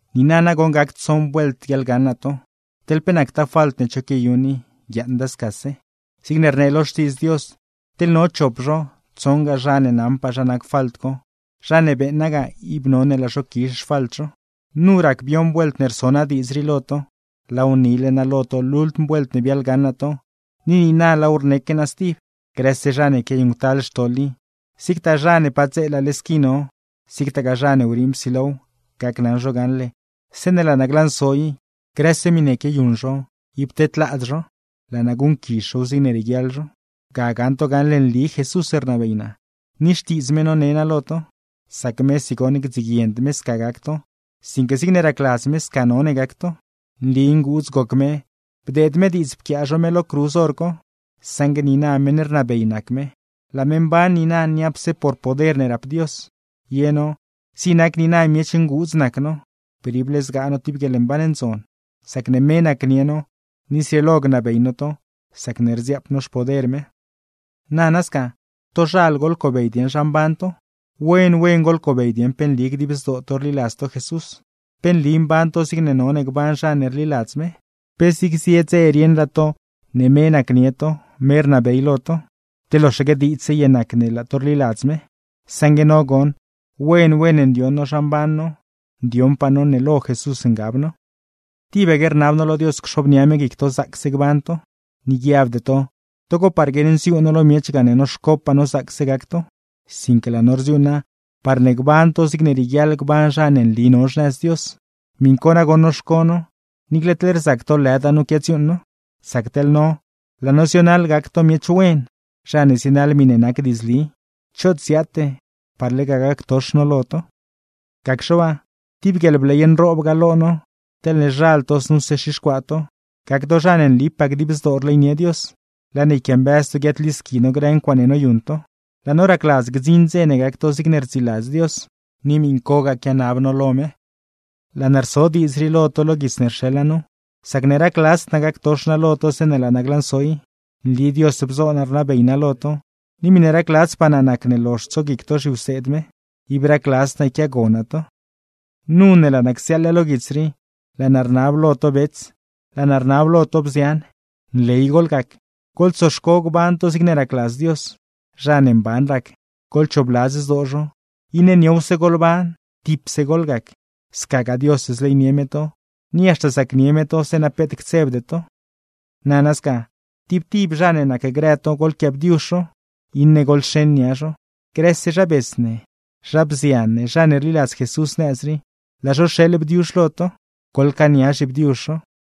Niina nagoṉ ne gac tsoṉ vuelt guiaḻgaṉ naa to, teḻ pe nactaa falt ne cho quiayuṉ i, guiaaṉda scase. Zigne rnee lo Xtiidz Dios: Teḻ no chop zho, tsoṉgaa zha ne naṉpaa zha nac falt co, zha ne beeṉa ga ib none laa zho quizh xfalt zho. Nu rac bioṉ vuelt ne rso naa diidz rii lo to. Laaw nile naa lo to lultm vuelt ne biaḻgaṉ naa to, ni niina laaw rneque naa stib: Grëse zha ne quiayuṉctal xtoḻ i, zigtaa zha ne padzeelale squi no, zigtagaa zha ne wriiṉ psilow, gacnaṉ zho gaṉle zeeṉe laa naa glanso i, grëse miṉe quiayuṉ zho ib tedlaad zho, laa naa guṉquizh zhow zigne rieguiaḻ zho. Ga gaṉ to gaṉle nli Jesús rnabey naa, ni Xtiidz me none naa lo to; sac mesi goṉ, gdziguiend me sca gac to, sinque zigne racladz me sca none gac to. Nli nguudz goc me bdeed me diidz pquiaa zho me lo cruz hor co, saṉgue niina meṉ rnabey nac me; laa me mban niina niapse por poder ne rap Dios. Ye no, zig nac niina miech nguudz nac no, per ible zgaa no tib guieḻmban ndzon, sacne me nacnie no; ni zrieelo gnabey no to sacne rdziaap no xpoder me. Nana sca, tozhal goḻcobey dieṉ zha mban to. Wen wen goḻcobey dieṉ pe nli dib zdoo to rliladz to Jesús. ¿Pe nli mban to zig none gban zha ne rliladz me? ¿Pe zig zie dze rieṉraa to ne me nacnie to, me rnabey lo to? ¿Te loxaque diidzse ye nac ne laa to rliladz me? Saṉgue no goṉ, wen wen ndioṉ no zha mban no, ndioṉpaa no ne lo Jesús ngab no. Tibaque rnab no lo Dios cxobnia me guic to zaacse gban to. Ni guiabde to togo par guiaṉnziuu no lo miech gane noxcopaa no zaacse gac to; sinque laa no rdziuuṉa parne gban to zigne rieguiaḻ gban zha ne nli no xnëz Dios. Miṉ co nagoṉ noxco no, niicle teḻ rzac to lëda nu quiadziuuṉ no. Sac teḻ no, laa no zionaḻ gac to miech wen, zha ne zienaḻ miṉe nac diidzli; choot ziaate par lega gactox no lo to. Gacxe waa, tib guieḻbley nroob ga lo no, teḻne zhal to znuse xixcuaa to, gac to zha ne nlipaa dib zdoo rleynie Dios; laa ne yquiambëz to guiaadlisqui no grë ncuaaṉe noyuṉ to. Laa no racladz gdziṉ dze ne gac to zigne rdziladz Dios, ni miṉcogaa quianab no lo me. Laa naa rso diidz rii lo to lo guits ne rxeḻ naa nu, sacne racladzd naa gactox naa lo to zeeṉe laa naa glanso i. Nli Dios bzo naa rnabey naa lo to, ni miṉe racladzpaa naa nacne lozh tsoguic to zhiwseed me; ib racladzd naa yquiaago naa to. Nu ne laa naa csiaaḻ lo guits rii, laa naa rnab lo to bets, laa naa rnab lo to bzian: Nley goḻgac, goḻtsoxco gban to zigne racladz Dios, zha ne mban rac, goḻchoobladz zdoo zho; iṉe niowse goḻban, tipse goḻgac. Scagaa Dios zleynie me to, ni haxta zacnie me to zeeṉa peet ctsebde to. Nana sca, tib tib zha ne nacgrë to goḻquiaabdiuzh zho, iṉe goḻxeṉ nia zho. Grëse zha bets ne, zha bzian ne, zha ne rliladz Jesús nëz rii; laa zho rxeeḻ bdiuzh lo to. Goḻcaania zhibdiuzh zho.